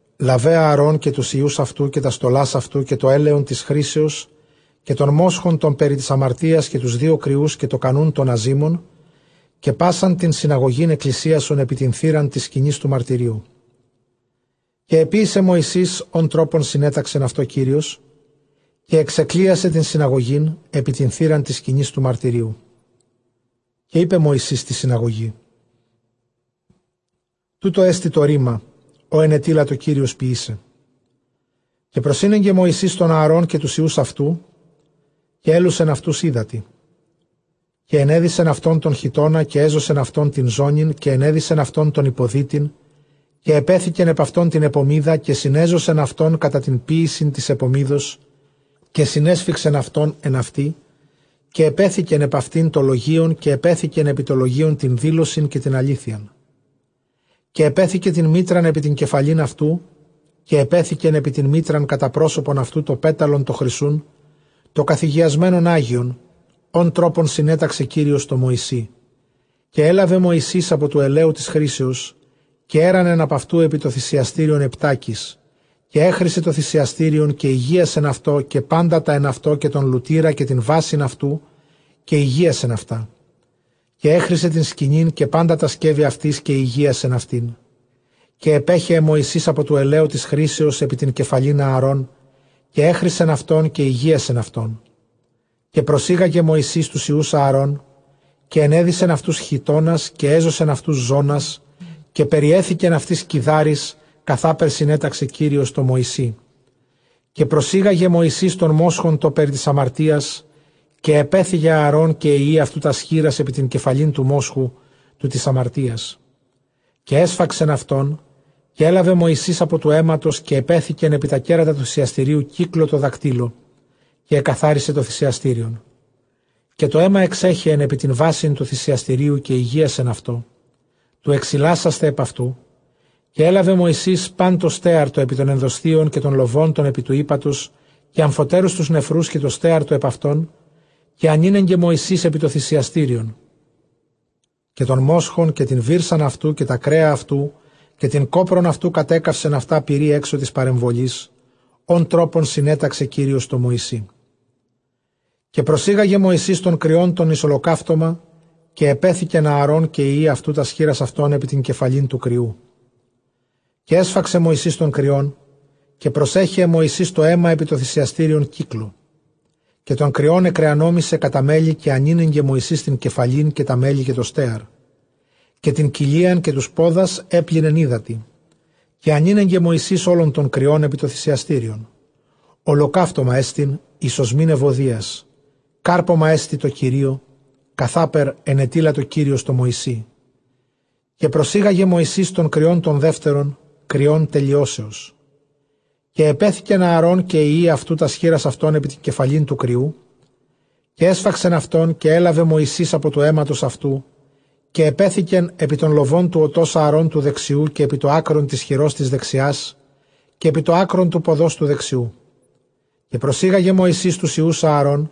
λάβε Ἀαρὼν καὶ τοὺς υἱοὺς αὐτοῦ, καὶ τὰς στολὰς αὐτοῦ, καὶ τὸ ἔλαιον τῆς χρίσεως, καὶ τὸν μόσχον τὸν περὶ τῆς ἁμαρτίας, καὶ τοὺς δύο κριοὺς, καὶ τὸ κανοῦν τῶν ἀζύμων, καὶ πᾶσαν τὴν συναγωγὴν ἐκκλησίασον ἐπὶ τὴν θύραν τῆς σκηνῆς τοῦ μαρτυρίου. Καὶ ἐποίησε Μωυσῆς ὃν τρόπον συνέταξεν αὐτῷ Κύριος· καὶ ἐξεκκλησίασε τὴν συναγωγὴν ἐπὶ τὴν θύραν τῆς σκηνῆς τοῦ μαρτυρίου. Καὶ εἶπε Μωυσῆς τῇ συναγωγῇ, τοῦτό ἐστι τὸ ῥῆμα, ὃ ἐνετείλατο Κύριος ποιῆσαι. Καὶ προσήνεγκε Μωυσῆς τὸν Ἀαρὼν, καὶ τοὺς υἱοὺς αὐτοῦ, καὶ ἔλουσεν αὐτοὺς ὕδατι. Καὶ ἐνέδυσεν αὐτὸν τὸν χιτῶνα, καὶ ἔζωσεν αὐτὸν τὴν ζώνην, καὶ ἐνέδυσεν αὐτὸν τὸν ὑποδύτην, καὶ ἐπέθηκεν ἐπʼ αὐτὸν τὴν ἐπωμίδα. Καὶ συνέζωσεν αὐτὸν κατὰ τὴν ποίησιν τῆς ἐπωμίδος, καὶ συνέσφιγξεν αὐτὸν ἐν αὐτῇ· καὶ ἐπέθηκεν ἐπʼ αὐτὴν τὸ λογεῖον, καὶ ἐπέθηκεν ἐπὶ τὸ λογεῖον τὴν δήλωσιν καὶ τὴν ἀλήθειαν. Καὶ ἐπέθηκε τὴν μίτραν ἐπὶ τὴν κεφαλὴν αὐτοῦ, καὶ ἐπέθηκεν ἐπὶ τὴν μίτραν κατὰ πρόσωπον αὐτοῦ τὸ πέταλον τὸ χρυσοῦν τὸ καθηγιασμένον ἅγιον, ὃν τρόπον συνέταξε Κύριος τῷ Μωυσῇ. Καὶ ἔλαβε Μωυσῆς ἀπὸ τοῦ ἐλαίου τῆς χρίσεως, καὶ ἔῤῥανεν ἀπʼ αὐτοῦ ἐπὶ τὸ θυσιαστήριον ἑπτάκις· καὶ ἔχρισε τὸ θυσιαστήριον, καὶ ἡγίασεν αὐτὸ, καὶ πάντα τὰ ἐν αὐτῷ, καὶ τὸν λουτῆρα, καὶ τὴν βάσιν αὐτοῦ, καὶ ἡγίασεν αὐτά· καὶ ἔχρισε τὴν σκηνὴν, καὶ πάντα τὰ σκεύη αὐτῆς, καὶ ἡγίασεν αὐτήν. Καὶ ἐπέχεε Μωυσῆς ἀπὸ τοῦ ἐλαίου τῆς χρίσεως ἐπὶ τὴν κεφαλὴν Ἀαρών· καὶ ἔχρισεν αὐτὸν, καὶ ἡγίασεν αὐτόν. Καὶ προσήγαγε Μωυσῆς τοὺς υἱοὺς Ἀαρὼν, καὶ ἐνέδυσεν αὐτοὺς χιτῶνας, καὶ ἔζωσεν αὐτοὺς ζώνας, καὶ περιέθηκεν αὐτοῖς κιδάρεις, καθάπερ συνέταξε Κύριος τῷ Μωυσῇ. Καὶ προσήγαγε Μωυσῆς τὸν μόσχον τὸν περὶ τῆς ἁμαρτίας· καὶ ἐπέθηκεν Ἀαρὼν καὶ οἱ υἱοὶ αὐτοῦ τὰς χεῖρας ἐπὶ τὴν κεφαλὴν τοῦ μόσχου τοῦ τῆς ἁμαρτίας. Καὶ ἔσφαξεν αὐτόν· καὶ ἔλαβε Μωυσῆς ἀπὸ τοῦ αἵματος, καὶ ἐπέθηκεν ἐπὶ τὰ κέρατα τοῦ θυσιαστηρίου κύκλῳ τῷ δακτύλῳ, καὶ ἐκαθάρισε τὸ θυσιαστήριον· καὶ τὸ αἷμα ἐξέχεεν ἐπὶ τὴν βάσιν τοῦ θυσιαστηρίου, καὶ ἡγίασεν αὐτὸ, τοῦ ἐξιλάσασθαι ἐπʼ αὐτοῦ. Καὶ ἔλαβε Μωυσῆς πᾶν τὸ στέαρ τὸ ἐπὶ τῶν ἐνδοσθίων, καὶ τὸν λοβὸν τὸν ἐπὶ τοῦ ἥπατος, καὶ ἀμφοτέρους τοὺς νεφροὺς, καὶ τὸ στέαρ τὸ ἐπʼ αὐτῶν, καὶ ἀνήνεγκε Μωυσῆς ἐπὶ τὸ θυσιαστήριον. Καὶ τὸν μόσχον, καὶ τὴν βύρσαν αὐτοῦ, καὶ τὰ κρέα αὐτοῦ, καὶ τὴν κόπρον αὐτοῦ, κατέκαυσεν αὐτὰ πυρὶ ἔξω τῆς παρεμβολῆς, ὃν τρόπον συνέταξε Κύριος τῷ Μωυσῇ. Καὶ προσήγαγε Μωυσῆς τὸν κριὸν τὸν εἰς ὁλοκαύτωμα· καὶ ἐπέθηκεν Ἀαρὼν καὶ υἱοὶ αὐτοῦ τὰς χεῖρας αὐτῶν ἐπὶ τὴν κεφαλὴν τοῦ κριοῦ. Καὶ ἔσφαξε Μωυσῆς τὸν κριόν· καὶ προσέχεε Μωυσῆς τὸ αἷμα ἐπὶ τὸ θυσιαστήριον κύκλῳ. Καὶ τὸν κριὸν ἐκρεανόμησε κατὰ μέλη· καὶ ἀνήνεγκε Μωυσῆς τὴν κεφαλὴν, καὶ τὰ μέλη, καὶ τὸ στέαρ· καὶ τὴν κοιλίαν, καὶ τοὺς πόδας ἔπλυνεν ὕδατι. Καὶ ἀνήνεγκε Μωυσῆς ὅλον τὸν κριὸν ἐπὶ τὸ θυσιαστήριον· ὁλοκαύτωμά ἐστιν εἰς ὀσμὴν εὐωδίας· κάρπωμά ἐστι τῷ Κυρίῳ, καθάπερ ἐνετείλατο Κύριος τῷ Μωυσῇ. Καὶ προσήγαγε Μωυσῆς τὸν κριὸν τὸν δεύτερον, κριὸν τελειώσεως· καὶ ἐπέθηκεν Ἀαρὼν καὶ οἱ υἱοὶ αὐτοῦ τὰς χεῖρας αὐτῶν ἐπὶ τὴν κεφαλὴν τοῦ κριοῦ. Καὶ ἔσφαξεν αὐτόν· καὶ ἔλαβε Μωυσῆς ἀπὸ τοῦ αἵματος αὐτοῦ, καὶ ἐπέθηκεν ἐπὶ τὸν λοβὸν τοῦ ὠτὸς Ἀαρὼν τοῦ δεξιοῦ, καὶ ἐπὶ τὸ ἄκρον τῆς χειρὸς τῆς δεξιᾶς, καὶ ἐπὶ τὸ ἄκρον τοῦ ποδὸς τοῦ δεξιοῦ. Καὶ προσήγαγε Μωυσῆς τοὺς υἱοὺς Ἀαρών·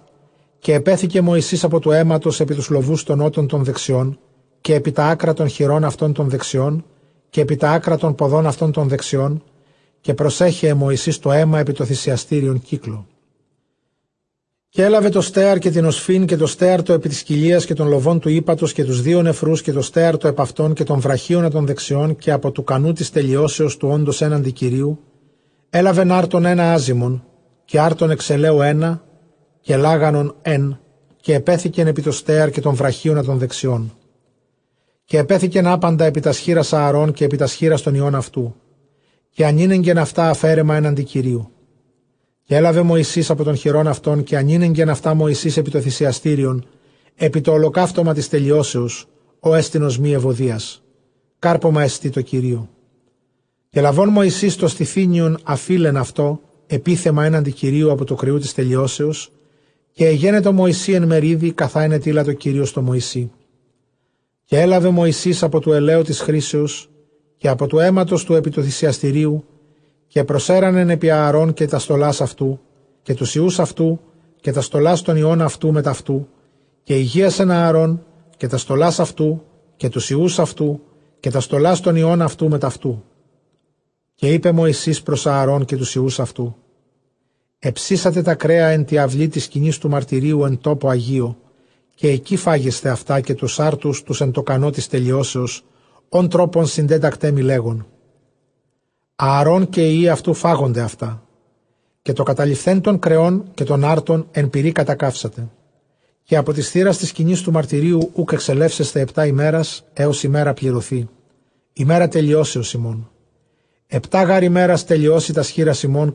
καὶ ἐπέθηκε Μωυσῆς ἀπὸ τοῦ αἵματος ἐπὶ τοὺς λοβοὺς τῶν ὤτων τῶν δεξιῶν, καὶ ἐπὶ τὰ ἄκρα τῶν χειρῶν αὐτῶν τῶν δεξιῶν· καὶ ἐπὶ τὰ ἄκρα τῶν ποδῶν αὐτῶν τῶν δεξιῶν· καὶ προσέχεε Μωυσῆς τὸ αἷμα ἐπὶ τὸ θυσιαστήριον κύκλῳ. Καὶ ἔλαβε τὸ στέαρ, καὶ τὴν ὀσφὺν, καὶ τὸ στέαρ τὸ ἐπὶ τῆς κοιλίας, καὶ τὸν λοβὸν τοῦ ἥπατος, καὶ τοὺς δύο νεφροὺς, καὶ τὸ στέαρ τὸ ἐπʼ αὐτῶν, καὶ τὸν βραχίονα τὸν δεξιόν. Καὶ ἀπὸ τοῦ κανοῦ τῆς τελειώσεως, τοῦ ὄντος ἔναντι Κυρίου, καὶ ἔλαβεν ἄρτον ἕνα ἄζυμον, καὶ ἄρτον ἐξ ἐλαίου ἕνα, καὶ λάγανον ἓν, καὶ ἐπέθηκεν ἐπὶ τὸ στέαρ, καὶ τὸν βραχίονα τὸν δεξιόν. Καὶ ἐπέθηκεν ἅπαντα ἐπὶ τὰς χεῖρας Ἀαρὼν, καὶ ἐπὶ τὰς χεῖρας τῶν υἱῶν αὐτοῦ, καὶ ἀνήνεγκεν αὐτὰ ἀφαίρεμα ἔναντι Κυρίου. Καὶ ἔλαβε Μωυσῆς ἀπὸ τῶν χειρῶν αὐτῶν, καὶ ἀνήνεγκεν αὐτὰ Μωυσῆς ἐπὶ τὸ θυσιαστήριον, ἐπὶ τὸ ὁλοκαύτωμα τῆς τελειώσεως, ὅ ἐστι ὀσμὴ εὐωδίας· κάρπωμά ἐστιν τῷ Κυρίῳ. Καὶ λαβὼν Μωυσῆς τὸ στηθύνιον, ἀφεῖλεν αὐτὸ ἐπίθεμα ἔναντι Κυρίου, ἀπὸ τοῦ κριοῦ τῆς τελειώσεως· καὶ ἐγένετο Μωυσῇ ἐν μεριδι, καθὰ ἐνετείλατο Κύριος τῷ Μωυσῇ. Καὶ ἔλαβε Μωυσῆς ἀπὸ τοῦ ἐλαίου τῆς χρίσεως, καὶ ἀπὸ τοῦ αἵματος τοῦ ἐπὶ τοῦ θυσιαστηρίου, καὶ προσέῤῥνεν ἐπὶ Ἀαρὼν, καὶ τὰς στολὰς αὐτοῦ, καὶ τοὺς υἱοὺς αὐτοῦ, καὶ τὰς στολὰς τῶν υἱῶν αὐτοῦ μετʼ αὐτοῦ. Καὶ ἡγίασεν Ἀαρὼν, καὶ τὰς στολάς αὐτοῦ, καὶ τοὺς υἱοὺς αὐτοῦ, καὶ τὰς στολὰς τῶν υἱῶν αὐτοῦ μετʼ αὐτοῦ. Καὶ εἶπε Μωυσῆς πρὸς Ἀαρὼν, καὶ τοὺς υἱοὺς αὐτοῦ, ἑψήσατε τὰ κρέα ἐν τῇ αὐλῇ τῆς σκηνῆς τοῦ μαρτυρίου ἐν τόπῳ ἁγίῳ· καὶ ἐκεῖ φάγεσθε αὐτὰ, καὶ τοὺς ἄρτους τοὺς ἐν τῷ κανῷ τῆς τελειώσεως, ὃν τρόπον συντέτακταί μοι, λέγων, Ἀαρὼν καὶ οἱ υἱοὶ αὐτοῦ φάγονται αὐτά. Καὶ τὸ καταλειφθὲν τῶν κρεῶν καὶ τῶν ἄρτων ἐν πυρὶ κατακαύσατε. Καὶ ἀπὸ τῆς θύρας τῆς σκηνῆς τοῦ μαρτυρίου οὐκ ἐξελεύσεσθε ἑπτὰ ἡμέρας, ἕως ἡμέρα πληρωθῇ, ἡμέρα τελειώσεως ὑμῶν· ἑπτὰ γὰρ ἡμέρας τελειώσει τὰς χεῖρας ὑμῶν.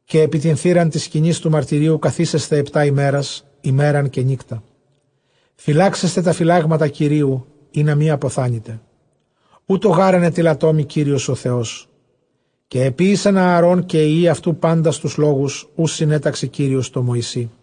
Καὶ ἐπὶ τὴν θύραν τῆς σκηνῆς τοῦ μαρτυρίου καθήσεσθε ἑπτὰ ἡμέρας, ἡμέραν καὶ νύκτα· φυλάξεσθε τὰ φυλάγματα Κυρίου, ἵνα μὴ ἀποθάνητε· οὕτω γὰρ ἐνετείλατό μοι Κύριος ὁ Θεός. Καὶ ἐποίησεν Ἀαρὼν καὶ οἱ υἱοὶ αὐτοῦ πάντας τοὺς λόγους, οὓς συνέταξε Κύριος τῷ Μωυσῇ.